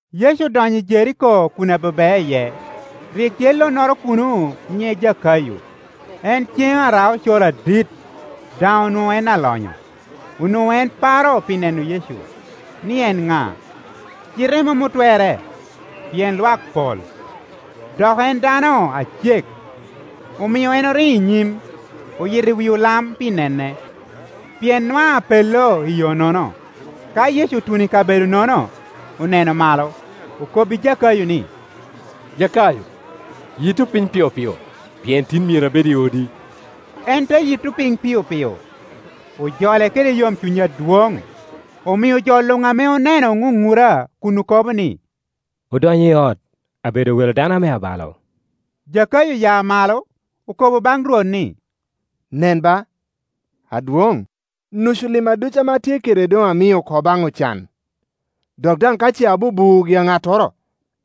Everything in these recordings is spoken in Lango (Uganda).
Yecu odonyo i Jeriko kun abebea iye. Rik tye lonnoro kuno nyiŋe Jakayo; en cen ara-ocoro adit, daŋ onwoŋo en alonyo. Onwoŋo en paro pi neno Yecu, ni en ŋa? Cite mom otwerre, pien lwak pol, dok en dano acek. Omio en oriŋo i nyim, oyito i wi olam pi nene, pien nwaŋ apello i yo-nono. Ka Yecu otuno i kabedo-nono, oneno malo, okobbi Jakayo ni, “Jakayo, yitto piny piopio, pien tin myero abed i odi.” En te yitto piny piopio, ojole kede yomcuny adwoŋ; omio jo luŋ ame oneno oŋuŋura kun okobo ni, “Odonyo i ot, abedo welo a dano ame abalo.” Jakayo oya malo, okobo baŋ Rwot ni, “Nen ba, Adwoŋ, nucu limma ducu ame atye kede doŋ amio oko baŋ ocan; dok daŋ ka ce abubuo gi-a ŋattoro,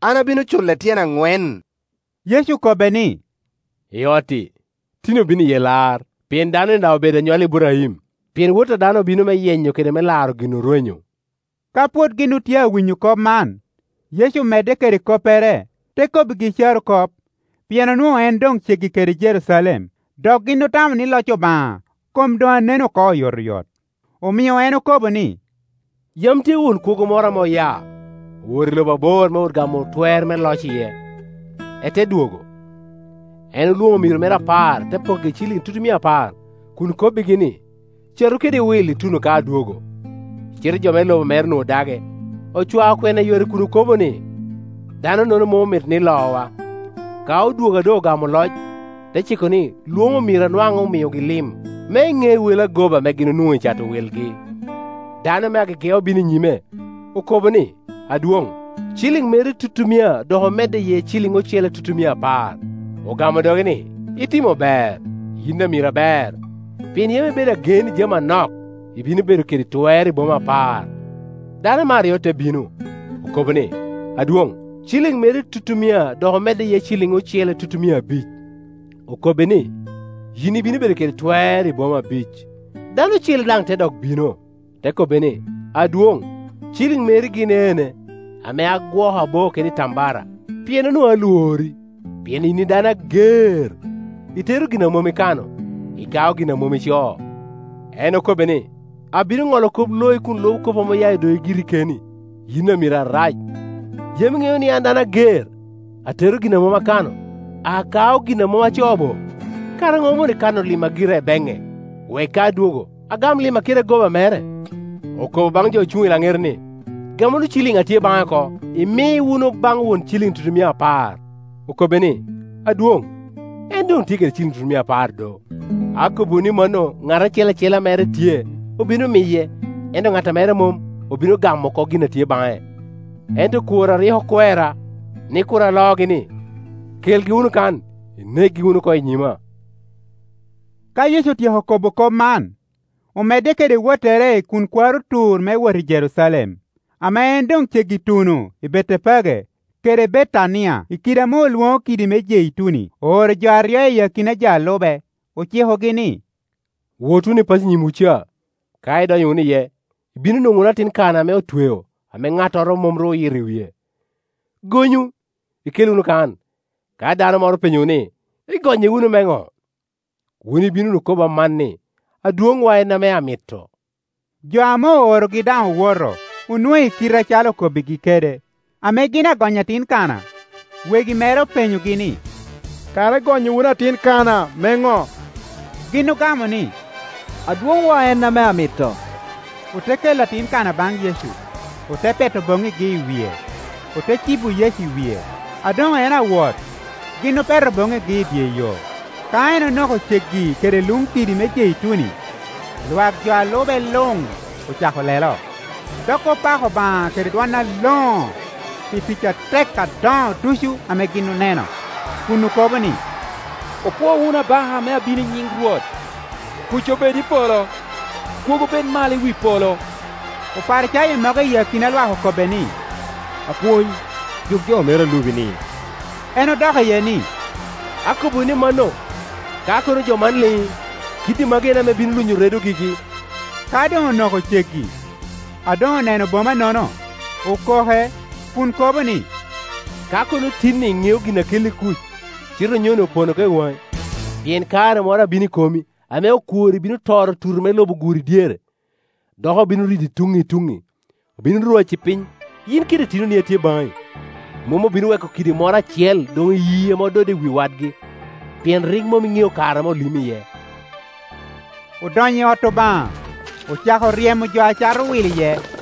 an abino cule tyen aŋwen.” Yecu okobbe ni, “I ot-ti tin obino iye lar, pien dano-ni daŋ obedo anywalli Iburaim. Pien Wot a dano obino me yenyo kede me laro gin orwenyo.” Ka pwod gin otye a winyo kop man, Yecu omedde kede koppere, te kobbigi carokop; pien onwoŋo en doŋ ceggi kede Jerucalem, dok gin otamo ni loc Obaŋa kom doŋ anen oko oyotoyot. Omio en okobo ni, “Yam tye won kwogo moro ame oya, owoto i lobo abor me wot gamo twer me loc iye, ete dwogo. En olwoŋo omiro mere apar, te pokkigi ciliŋ tutumia apar, kun kobogi ni, ‘Catu kede wil ituno ka adwogo.’ Cite jo me lobo mere onwoŋo dage; ocwao kwena i yore kun okobo ni, ‘Danonono mom omito ni lowa.’ Ka odwogo a doŋ ogamo loc, te ciko ni lwoŋ omiro a nwaŋ omiogi lim, me eŋe wel agoba ame gin onwoŋo i cato wilgi. Dano me agege obino i nyime, okobo ni, ‘Adwoŋ, ciliŋ meri tutumia dok omedde iye ciliŋ ocele tutumia apar.’ Ogamo doge ni, ‘Itimo ber, yin amiro aber! Pien yam ibedo agen i jami anok, ibino bedo kede twer i boma apar.’ Dano me aryo te bino, okobo ni, ‘Adwoŋ, ciliŋ meri tutumia dok omedde iye ciliŋ ocele tutumia abic.’ Okobbe ni, ‘Yin ibino bedo kede twer i boma abic.’ Dano ocele daŋ te dok bino, te kobbe ni, ‘Adwoŋ, ciliŋ meri gin ene, ame agwoko aboo kede itambara; pien onwoŋo alwori, pien yin dano ager, itero gin a mom ikano, ikaa gin a mom icoo.’ En okobbe ni, ‘Abino Ŋolo kop loi kun lubo kop ame oya i dogi giri keni, yin amiro arac. Yam iŋeo ni an a dano ager, atero gin a mom akane, akao gin a mom acoo bo? Kara no omoni kano limma gira i beŋŋe, wek ka adwogo, agam limma kede agoba mere?’ Okobo baŋ jo ocuŋ i laŋete ni, ‘Gam wunu ciliŋ a tye baŋe oko, imi wunu baŋ won ciliŋ tutumia apar.’ Okobbe ni, ‘Adwoŋ, en doŋ tye i ciliŋ tutumia apar do! Akobbiwu ni mano. Ŋat acel acel ame mere tye, obino miye, ento ŋat a mere mom, obino gamo oko gin a tye baŋe. Ento okworra a rik okwera, ni kur alogi-ni, kelgi wunu kan, inekgi wunu oko i nyima.’” Ka Yecu otyeko kobo kop man, omedde kede wottere kun kwaro tur me wot i Jerucalem. Ame en doŋ ceggi tuno i Betepage kede Betania, i kidi ame olwoŋo kidi me Jeituni, ooro jo aryo i akina jo a lube, ocikogi ni, “Wot wunu i paco i nyimwu ca. Ka idonyo wunu iye, ibino nwoŋo wunu atin kana ame otweo, ame ŋattoro mom ru oyito i wie; gonyu, ikel wunu kan. Ka dano moro openyowu ni, ‘Igonye wunu me ŋo?’ wun ibino wunu kobo aman ni, ‘Adwoŋwa en ame amito.’” Jo ame oorogi daŋ owoto, onwoŋo i kite acalo okobbigi kede. Ame gin agonyo atin kana, wegi mere openyogi ni, “Kara igonyo wunu atin kana me ŋo?” Gin ogamo ni, “Adwoŋwa en ame amito.” Ote kelo atin kana baŋ Yecu, ote peto boŋŋigi i wie, ote cibo Yecu i wie. A doŋ en awot, gin opeto boŋŋigi i dye yo. Ka en onoko ceggi kede luŋ kidi me Jeituni, lwak jo a lube luŋ ocako lelo, dok opako Obaŋa kede dwon aloŋo pi tic atek adoŋo ducu ame gin oneno, kun okobo ni, “Opwo wunu abaka ame abino nyiŋ Rwot! Kuc obed i polo, kwogo bed malo i wi polo!” Oparicayo mogo i akina lwak okobbe ni, “Apwony, juk jo meri a lubi-ni.” En odok iye ni, “Akobbiwu ni mano, ka kono jo man liŋ i, kiddi magi en ame bino lunyo redo gigi.” Ka doŋ onoko ceggi, a doŋ oneno boma-nono, okoke, kun kobo ni, “Ka kono tin-ni iŋeo gin a kelli kuc! Cite onyoni opono oko i waŋi. Pien kare moro abino i komi, ame okworri bino toro tuti me lobo guri dyere, dok obino ridi tuŋŋi i tuŋŋi. Obino rwaci piny, yin kede itinoni a tye baŋi; mom obino weko kidi moro acel doŋ iyii ame ododde i wi wadgi, pien rik mom iŋeo kare ame olimi iye.” Odonyo i ot Obaŋa, ocako ryemo jo a cato wil iye,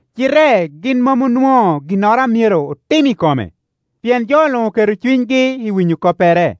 cite gin mom onwoŋo ginnoro a myero otim i kome, pien jo luŋ oketo cunygi i winyo koppere.